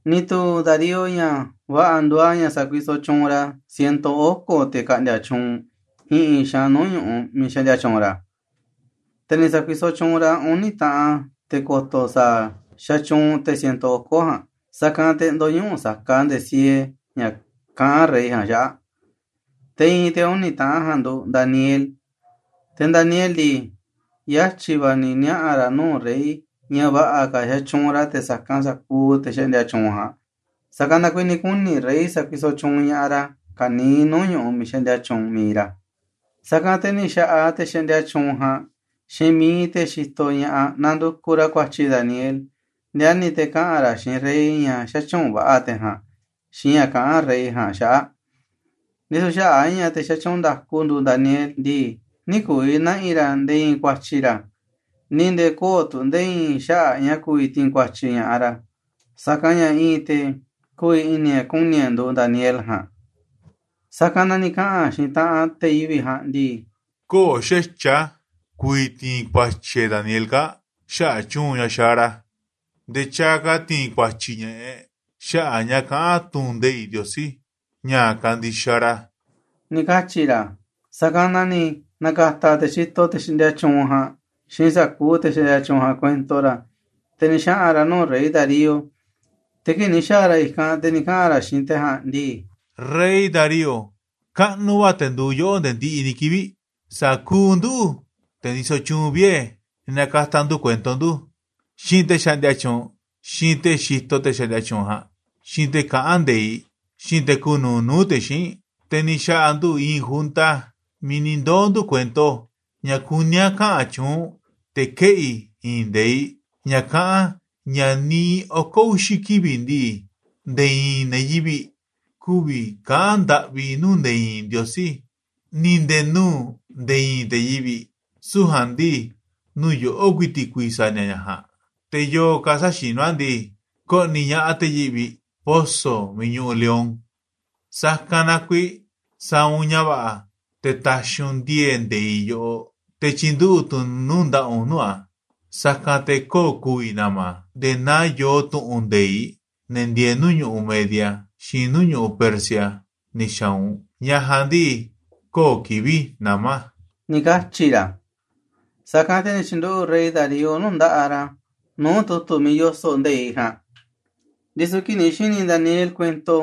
Ni̱ tu̱u̱ Darío ña̱ va̱ꞌa̱ nduuꞌ a̱ ña̱ sa̱kuisoꞌ tyuunꞌ ra̱ ciento oko̱ te̱ ka̱ꞌndi̱a̱ tyuunꞌ i̱ꞌi̱n xaanꞌ nuu̱ꞌ ñu̱ꞌuꞌ miiꞌ xaꞌndia tyuunꞌ ra̱. Te̱ ni̱ sa̱kuisoꞌ tyuunꞌ ra̱ uni̱ taꞌan te̱ ko̱to̱ sa̱a̱ xatyuunꞌ te̱ ciento oko̱ ja̱a̱nꞌ, sa̱kanꞌ te̱ ndö̱ñuꞌuꞌ saka nde̱e̱ siee ña̱ kaꞌán rey ja̱a̱nꞌ xaꞌa̱ꞌ. Te̱ i̱i̱n te̱ uni̱ taꞌan ja̱a̱nꞌ nduuꞌ Daniel. Te̱ Daniel ndii, yatyi̱ va̱ ni̱ niaꞌa̱ ra̱ nuu̱ꞌ rey ña̱ va̱ꞌa̱ ka̱ xatyuunꞌ ra̱ te̱ sa̱kanꞌ sa̱kuuꞌ te̱ xaꞌndia tyuunꞌ ja̱a̱nꞌ, sa̱kanꞌ na kuiiꞌ ni̱ kuni̱ rey sa̱kuisoꞌ tyuunꞌ ña̱ꞌaꞌ ra̱ ka̱niiꞌ nuu̱ꞌ ñu̱ꞌuꞌ miiꞌ xaꞌndia tyuunꞌ mi̱iꞌ ra̱. Sa̱kanꞌ te̱ ni̱ xa̱ꞌaꞌ te̱ xaꞌndia tyuunꞌ ja̱a̱nꞌ xiinꞌ mi̱iꞌ te̱ xitoꞌ ña̱ꞌaꞌ nandukuꞌ ra̱ ku̱a̱tyi̱ Daniel, ndiani̱ te̱ kaꞌa̱n ra̱ xiinꞌ rey ña̱ xätyuunꞌ va̱ꞌa̱ te̱ ja̱a̱nꞌ xiinꞌ ña̱ kaꞌán rey ja̱a̱nꞌ xaꞌa̱ꞌ. Ndisu̱ xaꞌa̱ꞌ a̱ ña̱ te̱ xatyuunꞌ nda̱ku nduuꞌ Daniel ndii, nï̱ ku̱vi̱ na̱ꞌi̱ ra̱ nde̱e̱ i̱i̱n ku̱a̱tyi̱ ra̱, ni̱ nde̱e̱ kö̱o̱ tu̱ nde̱e̱ i̱i̱n xaꞌa̱ꞌ ña̱ ku̱vi̱ ti̱i̱n ku̱a̱tyi̱ ña̱ꞌaꞌ ra̱, sa̱kanꞌ ña̱ i̱i̱n te̱ ku̱vi̱ i̱ni̱ e̱ꞌ ku̱ni̱ e̱ꞌ nduuꞌ Daniel ja̱a̱nꞌ. Sa̱kanꞌ na ni̱ kaꞌa̱n xiinꞌ taꞌanꞌ te̱ yivi̱ꞌ ja̱a̱nꞌ ndii: “Köo̱ꞌ xa̱tyiꞌ a̱ ku̱vi̱ ti̱i̱n kua̱tyi̱ e̱ꞌ Daniel kaa̱ꞌ xaꞌa̱ꞌ tyu̱u̱n ña̱ xaaꞌ ra̱, nde̱e̱ tyaaꞌ ka̱ ti̱i̱n ku̱a̱tyi̱ ña̱ꞌaꞌ e̱ꞌ xaꞌa̱ꞌ ña̱ kaꞌán tu̱ꞌu̱n nde̱iꞌ Ndiosí, ña̱ kandixaꞌ ra̱,” ni̱ katyi̱ ra̱. Sa̱kanꞌ na ni̱ na̱ka̱ta̱ te̱ xitoꞌ te̱ xaꞌndia tyuunꞌ ja̱a̱nꞌ xiinꞌ sa̱kuuꞌ te̱ xaꞌndia tyuunꞌ ja̱a̱nꞌ kuento ra̱, te̱ ni̱ xaꞌa̱n ra̱ nuu̱ꞌ rey Darío, te̱ kii̱ꞌ ni̱ xa̱a̱ ra̱ i̱kanꞌ, te̱ ni̱ kaꞌa̱n ra̱ xiinꞌ te̱ ja̱a̱nꞌ ndii: ―Rey Darío, kaꞌnuꞌ va̱ te̱ nduuꞌ yoꞌó nde̱e̱ ndiꞌiꞌ ni̱ kivi̱ꞌ. Sa̱kuuꞌ nduꞌu̱, te̱ ndisoꞌ tyuunꞌ vie̱, ni̱ na̱ka̱ta̱ ndu̱ kuento ndu̱, xiinꞌ te̱ xaꞌndia tyuunꞌ, xiinꞌ te̱ xitoꞌ te̱ xaꞌndia tyuunꞌ ja̱a̱nꞌ, xiinꞌ te̱ kaꞌán nde̱iꞌ, xiinꞌ te̱ kuuꞌ nuuꞌ nuu̱ꞌ te̱ xíinꞌ, te̱ ni̱ xa̱ꞌa̱ ndu̱ i̱i̱n junta miiꞌ ni̱ ndoo̱ ndu̱ kuento ña̱ kuní a̱ kaꞌa̱n tyuunꞌ u̱nꞌ, te̱ keꞌi̱ i̱i̱n nde̱iꞌ ña̱ kaꞌán ña̱ niiꞌ oko̱ uxi̱ kivi̱ꞌ ndii, nde̱e̱ i̱i̱n ne̱ yivi̱ꞌ kü̱vi̱ kaꞌa̱n ndaꞌvi nuu̱ꞌ nde̱e̱ i̱i̱n ndiosí, ni̱ nde̱e̱ nuu̱ꞌ nde̱e̱ i̱i̱n te̱ yivi̱ꞌ, süu̱ꞌ ja̱a̱nꞌ ndii, nuu̱ꞌ yoꞌó ku̱i̱ti̱ꞌ ku̱vi̱ sa̱a̱ ni̱a̱ ña̱ ja̱a̱nꞌ. Te̱ yo̱o̱ ka̱ säxinú a̱ ndii, ko̱ꞌni̱ ña̱ꞌaꞌ te̱ yivi̱ꞌ poso̱ miiꞌ ñuꞌuꞌ lion. Sa̱kanꞌ na kuiiꞌ sa̱a̱ u̱nꞌ ña̱ va̱ꞌa̱, te̱ ta̱xi̱ u̱nꞌ ndi̱e̱e̱ꞌ nde̱iꞌ yoꞌoꞌ, te̱ tyi̱nduꞌu̱ꞌ tu̱ u̱nꞌ nuu̱ꞌ nda̱ꞌaꞌ u̱nꞌ nuu̱ꞌ a̱, sa̱kanꞌ te̱ kö̱o̱ ku̱vi̱ na̱ma̱ a̱, nde̱e̱ naa yoo tu̱ꞌu̱n nde̱iꞌ ne̱ ndieeꞌ nuu̱ꞌ ñu̱ꞌuꞌ Media, xiinꞌ nuu̱ꞌ ñu̱ꞌuꞌ Persia ni̱ xa̱a̱ u̱nꞌ, ña̱ ja̱a̱nꞌ ndii, kö̱o̱ kivi̱ꞌ nama̱ a̱ ―ni̱ katyi̱ ra̱. Sa̱kanꞌ na ni̱ tyi̱nduꞌu̱ꞌ rey Darío nuu̱ꞌ nda̱ꞌaꞌ ra̱ nuu̱ꞌ tu̱tu̱ miiꞌ yoso̱ꞌ nde̱iꞌ ja̱a̱nꞌ. Ndisu̱ kii̱ꞌ ni̱ xi̱ni̱ Daniel kuento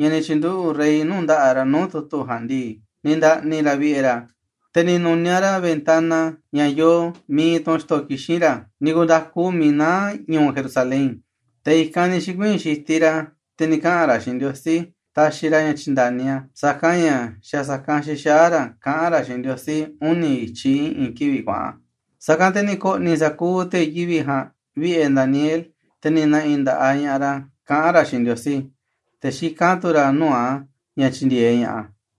ña̱ ni̱ tyi̱nduꞌu̱ꞌ rey nuu̱ꞌ nda̱ꞌaꞌ ra̱ nuu̱ꞌ tu̱tu̱ ja̱a̱nꞌ ndii, ni̱ nda̱ꞌni̱ ra̱ vi̱ꞌe̱ ra̱, te̱ ni̱ nu̱niaꞌ ra̱ ventana ña̱ yoo miiꞌ iinꞌ tunꞌ xto̱ kixín ra̱, ni̱ ku̱nda̱ku miiꞌ naá ñu̱u̱ Jerusalén. Te̱ i̱kanꞌ ni̱ xi̱kuii̱n xitiꞌ ra̱, te̱ ni̱ kaꞌa̱n ra̱ xiinꞌ Ndiosí taxiꞌ ra̱ ña̱ tyi̱nda̱ni a̱, sa̱kanꞌ ña̱ xa̱ sa̱kanꞌ xixaá ra̱ kaꞌán ra̱ xiinꞌ Ndiosí uni̱ i̱tyiꞌ i̱ꞌi̱n kivi̱ꞌ kuaꞌa̱n. Sa̱kanꞌ te̱ ni̱ ko̱ꞌni̱ sa̱kuuꞌ te̱ yivi̱ꞌ ja̱a̱nꞌ vi̱ꞌe̱ Daniel, te̱ ni̱ na̱ꞌi̱ nda̱ꞌaꞌ ña̱ꞌaꞌ ra̱ kaꞌán ra̱ xiinꞌ Ndiosí, te̱ xikán tu̱ ra̱ nuu̱ꞌ a̱ ña̱ tyi̱ndi̱e̱eꞌ ña̱ꞌaꞌ a̱.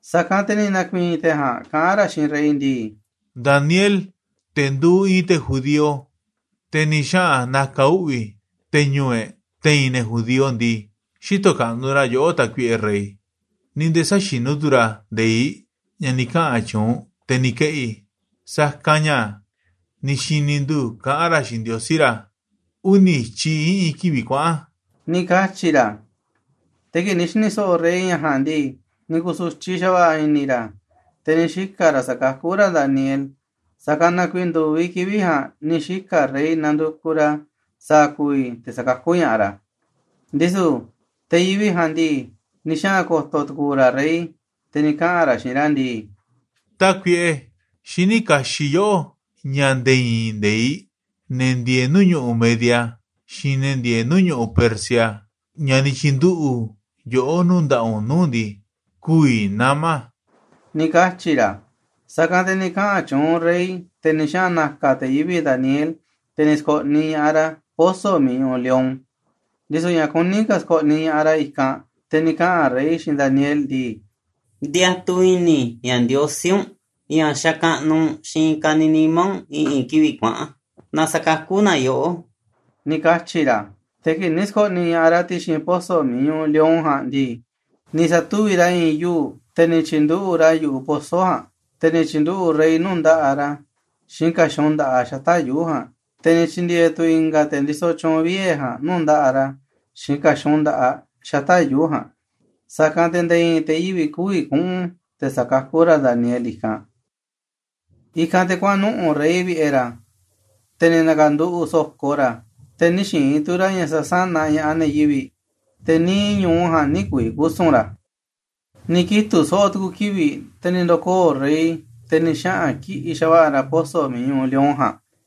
Sa̱kanꞌ te̱ ni̱ na̱ku̱i̱i̱n te̱ ja̱a̱nꞌ kaꞌán ra̱ xiinꞌ rey ndii: ―Daniel, te̱ nduuꞌ i̱i̱n te̱ judío, te̱ ni̱ xaꞌa̱n na̱ka̱ uꞌvi̱ te̱ ñu̱u̱ e̱ꞌ te̱i̱n ne̱ judío ndii, xïtoꞌ kaꞌnuꞌ ra̱ yoꞌó, tákuiꞌe rey, ni̱ nde̱e̱ säxinú tu̱ ra̱ nde̱iꞌ ña̱ ni̱ kaꞌa̱n tyuunꞌ u̱nꞌ, te̱ ni̱ keꞌi̱, sa̱kanꞌ ña̱ ni̱ xi̱ni̱ ndu̱ kaꞌán ra̱ xiinꞌ Ndiosí ra̱ uni̱ i̱tyiꞌ i̱ꞌi̱n kivi̱ꞌ kuaꞌa̱n ―ni̱ katyi̱ ra̱. Te̱ kii̱ꞌ ni̱ xi̱ni̱ so̱ꞌo̱ rey ña̱ ja̱a̱nꞌ ndii, ni̱ ku̱su̱tyiꞌ xa̱va̱ꞌa̱ i̱ni̱ ra̱, te̱ ni̱ xika̱ ra̱ sa̱kakú ra̱ Daniel. Sa̱kanꞌ na kuiiꞌ ndu̱viꞌ kivi̱ꞌ ja̱a̱nꞌ ni̱ xika̱ rey nandukuꞌ ra̱ sa̱a̱ ku̱vi̱ te̱ sa̱kakú ña̱ꞌaꞌ ra̱. Ndisu̱ te̱ yivi̱ꞌ ja̱a̱nꞌ ndii, ni̱ xaꞌa̱n ko̱to̱ tu̱ku̱u̱ ra̱ rey, te̱ ni̱ kaꞌa̱n ra̱ xiinꞌ ra̱ ndii: ―Tákuiꞌe, xiní kaxiꞌ yoꞌó ña̱ nde̱e̱ i̱i̱n nde̱iꞌ ne̱ ndieeꞌ nuu̱ꞌ ñu̱ꞌuꞌ Media, xiinꞌ ne̱ ndieeꞌ nuu̱ꞌ ñu̱ꞌuꞌ Persia, ña̱ ni̱ tyi̱nduꞌu̱ꞌ yoꞌó nuu̱ꞌ nda̱ꞌaꞌ u̱nꞌ nuu̱ꞌ ndii, kü̱vi̱ nama̱ a̱ ―ni̱ katyi̱ ra̱. Sa̱kanꞌ te̱ ni̱ kaꞌa̱n tyuunꞌ rey, te̱ ni̱ xaꞌa̱n na̱ka̱ te̱ yivi̱ꞌ Daniel, te̱ ni̱ sko̱ꞌniꞌ ña̱ꞌaꞌ ra̱ poso̱ miiꞌ ñuꞌuꞌ lion. Ndisu̱ ña̱ kuní ka̱ sko̱ꞌniꞌ ña̱ꞌaꞌ ra̱ i̱kanꞌ, te̱ ni̱ kaꞌa̱n rey xiinꞌ Daniel ndii: ―Ndiatuꞌ i̱ni̱ i̱ ña̱ Ndiosí u̱nꞌ, ña̱ xakaꞌnuꞌ u̱nꞌ xiinꞌ ka̱niiꞌ nimá u̱nꞌ i̱ꞌi̱n kivi̱ꞌ kuaꞌa̱n, na sa̱kakú na yoꞌó ―ni̱ katyi̱ ra̱. Te̱ kii̱ꞌ ni̱ sko̱ꞌniꞌ ña̱ꞌaꞌ ra̱ ti̱xi̱n poso̱ miiꞌ ñuꞌuꞌ lion ja̱a̱nꞌ ndii, ni̱ sa̱tuvi̱ꞌ ra̱ i̱i̱n yuu̱ꞌ, te̱ ni̱ tyi̱nduꞌu̱ꞌ ra̱ a̱ yu̱ꞌuꞌ poso̱ ja̱a̱nꞌ, te̱ ni̱ tyi̱nduꞌu̱ꞌ rey nuu̱ꞌ nda̱ꞌaꞌ ra̱ xiinꞌ ka̱xun nda̱ꞌaꞌ xata̱ꞌ yuu̱ꞌ ja̱a̱nꞌ, te̱ ni̱ tyi̱ndi̱e̱e̱ tu̱ i̱nga̱ te̱ ndisoꞌ tyuunꞌ vie̱ ja̱a̱nꞌ nuu̱ꞌ nda̱ꞌaꞌ ra̱ xiinꞌ ka̱xun nda̱ꞌaꞌ xata̱ꞌ yuu̱ꞌ ja̱a̱nꞌ, sa̱kanꞌ te̱ nde̱e̱ i̱i̱n te̱ yivi̱ꞌ kü̱vi̱ kuꞌu̱n te̱ sa̱kakú ra̱ Daniel i̱kanꞌ. I̱kanꞌ te̱ kuaꞌa̱n nuꞌu̱ꞌ rey vi̱ꞌe̱ ra̱, te̱ ni̱ na̱ka̱nduꞌu̱ꞌ so̱ko ra̱, te̱ nï̱ xi̱i̱n tu̱ ra̱ ña̱ sa̱sánaꞌ ña̱ꞌaꞌ ne̱ yivi̱ꞌ, te̱ niiꞌ ñu̱u ja̱a̱nꞌ nï̱ ku̱vi̱ kusu̱n ra̱. Ni̱ kitu̱ꞌ so̱ꞌo̱ tu̱ku̱ kivi̱ꞌ, te̱ ni̱ ndo̱koo̱ rey, te̱ ni̱ xaꞌa̱n kiꞌi̱ꞌ xa̱va̱ꞌa̱ ra̱ poso̱ miiꞌ ñuꞌuꞌ lion ja̱a̱nꞌ.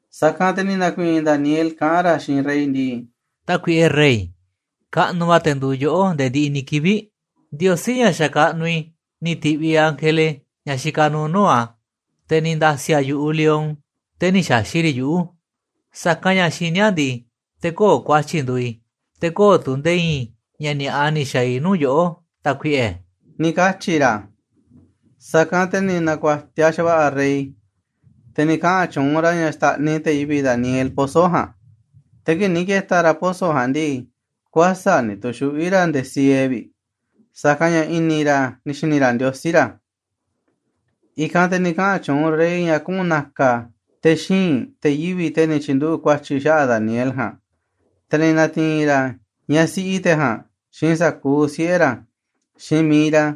Sa̱kanꞌ te̱ ni̱ na̱ku̱i̱i̱n Daniel kaꞌán ra̱ xiinꞌ rey ndii: ―Tákuiꞌe rey, kaꞌnuꞌ va̱ te̱ nduuꞌ yoꞌó nde̱e̱ ndiꞌiꞌ ni̱ kivi̱ꞌ. Ndiosí, ña̱ xakaꞌnuꞌ i̱ ni̱ ti̱ꞌviꞌ ángele, ña̱ xikaꞌ nuuꞌ nuu̱ꞌ a̱, te̱ ni̱ nda̱si̱ a̱ yu̱ꞌuꞌ lion, te̱ nï̱ xa̱xi̱ꞌ riꞌ yuꞌu̱, sa̱kanꞌ ña̱ xiní a̱ ndii, te̱ kö̱o̱ ku̱a̱tyi̱ nduuꞌ i̱, te̱ kö̱o̱ tu̱ nde̱e̱ i̱i̱n ña̱ ni̱a̱ꞌa ni̱ xa̱a̱ i̱ nuu̱ꞌ yoꞌó, tákuiꞌe ―ni̱ katyi̱ ra̱. Sa̱kanꞌ te̱ ni̱ na̱ku̱a̱tiaꞌ xa̱va̱ꞌa̱ rey, te̱ ni̱ kaꞌa̱n tyuunꞌ ra̱ ña̱ xta̱ꞌniꞌ te̱ yivi̱ꞌ Daniel poso̱ ja̱a̱nꞌ. Te̱ kii̱ꞌ ni̱ ke̱ta̱ ra̱ poso̱ ja̱a̱nꞌ ndii, kuäsa̱ꞌ ni̱ tu̱xuꞌví ra̱ nde̱e̱ siee vi̱ꞌ, sa̱kanꞌ ña̱ i̱ni̱ ra̱ ni̱ xi̱ni̱ ra̱ Ndiosí ra̱. I̱kanꞌ te̱ ni̱ kaꞌa̱n tyuunꞌ rey ña̱ kuꞌu̱n na̱ka̱ te̱ xíinꞌ te̱ yivi̱ꞌ, te̱ ni̱ tyi̱nduꞌu̱ꞌ ku̱a̱tyi̱ xaꞌa̱ꞌ Daniel ja̱a̱nꞌ, te̱ ni̱ na̱ti̱i̱n ra̱ ñaꞌ siꞌi te̱ ja̱a̱nꞌ, xiinꞌ sa̱kuuꞌ siꞌe̱ ra̱, xiinꞌ mi̱iꞌ ra̱,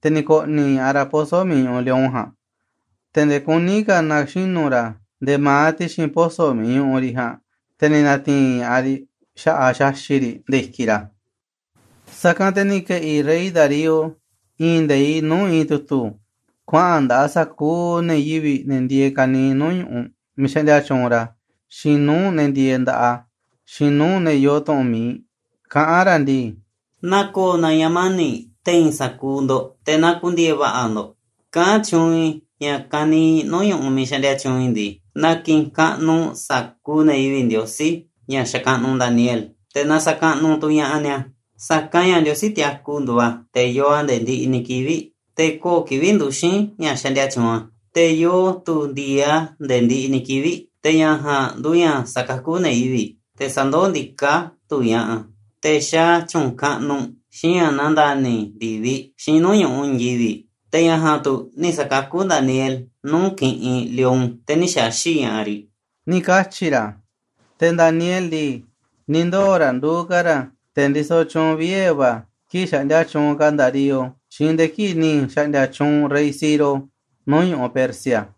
te̱ ni̱ ko̱ꞌni̱ ña̱ꞌaꞌ ra̱ poso̱ miiꞌ ñuꞌuꞌ lion ja̱a̱nꞌ. Te̱ nde̱e̱ kuní ka̱ na̱xinu̱ ra̱ nde̱e̱ ma̱aꞌ ti̱xi̱n poso̱ miiꞌ ñuꞌuꞌ riꞌ ja̱a̱nꞌ, te̱ ni̱ na̱ti̱i̱n ña̱ꞌaꞌ riꞌ xa̱ꞌaꞌ xaxi̱ꞌ riꞌ nde̱e̱ i̱kiꞌ ra̱. Sa̱kanꞌ te̱ ni̱ ke̱ꞌi̱ rey Darío i̱i̱n nde̱iꞌ nuu̱ꞌ i̱i̱n tu̱tu̱, kuaꞌa̱n nda̱ꞌaꞌ sa̱kuuꞌ ne̱ yivi̱ꞌ, ne̱ ndieeꞌ ka̱niiꞌ nuu̱ꞌ ñu̱ꞌuꞌ miiꞌ xaꞌndia tyuunꞌ ra̱, xiinꞌ nuu̱ꞌ ne̱ ndieeꞌ nda̱ꞌaꞌ a̱, xiinꞌ nuuꞌ ne̱ yoo tu̱ꞌu̱n mi̱iꞌ, kaꞌán ra̱ ndii: “Na ko̱o̱ na̱ ña̱ mani̱ꞌ te̱i̱n sa̱kuuꞌ ndo̱ꞌ, te̱ na ku̱ndi̱e̱e̱ va̱ꞌa̱ ndo̱ꞌ. Kaꞌán tyuunꞌ i̱ ña̱ ka̱niiꞌ nuu̱ꞌ ñu̱ꞌuꞌ miiꞌ xaꞌndia tyuunꞌ i̱ ndii, na ki̱ꞌi̱n kaꞌnuꞌ sa̱kuuꞌ ne̱ yivi̱ꞌ Ndiosí, ña̱ xakaꞌnuꞌ Daniel, te̱ na sa̱kaꞌnuꞌ tu̱ ña̱ꞌaꞌ ni̱a̱. Sa̱kanꞌ ña̱ Ndiosí tiaku nduuꞌ a̱, te̱ yoo a̱ nde̱e̱ ndiꞌiꞌ ni̱ kivi̱ꞌ, te̱ köo̱ꞌ kivi̱ꞌ nduxi̱n ña̱ xaꞌndia tyuunꞌ a̱, te̱ yoo tu̱ ndi̱e̱e̱ꞌ a̱ nde̱e̱ ndiꞌiꞌ ni̱ kivi̱ꞌ. Te̱ ña̱ ja̱a̱nꞌ nduuꞌ ña̱ sa̱kakú ne̱ yivi̱ꞌ, te̱ sa̱ndoó ndiká tu̱ ña̱ꞌaꞌ a̱, te̱ xaaꞌ a̱ tyu̱u̱n kaꞌnuꞌ, xiinꞌ ña̱ nandani̱ ndi̱viꞌ, xiinꞌ nuu̱ꞌ ñu̱ꞌuꞌ i̱i̱n yivi̱ꞌ. Te̱ ña̱ ja̱a̱nꞌ tu̱ ni̱ sa̱kakú Daniel nuu̱ꞌ kiꞌinꞌ lion, te̱ nï̱ xa̱xi̱ꞌ ña̱ꞌaꞌ riꞌ,” ni̱ katyi̱ ra̱. Te̱ Daniel ndii, ni̱ ndoo̱ ra̱ nduuꞌ ka̱ ra̱ te̱ ndisoꞌ tyuunꞌ vie̱ va̱ kii̱ꞌ xaꞌndia tyuunꞌ ka̱ Darío, xiinꞌ nde̱e̱ kii̱ꞌ ni̱ xa̱ꞌndi̱a̱ tyuunꞌ rey Ciro nuu̱ꞌ ñu̱ꞌuꞌ Persia.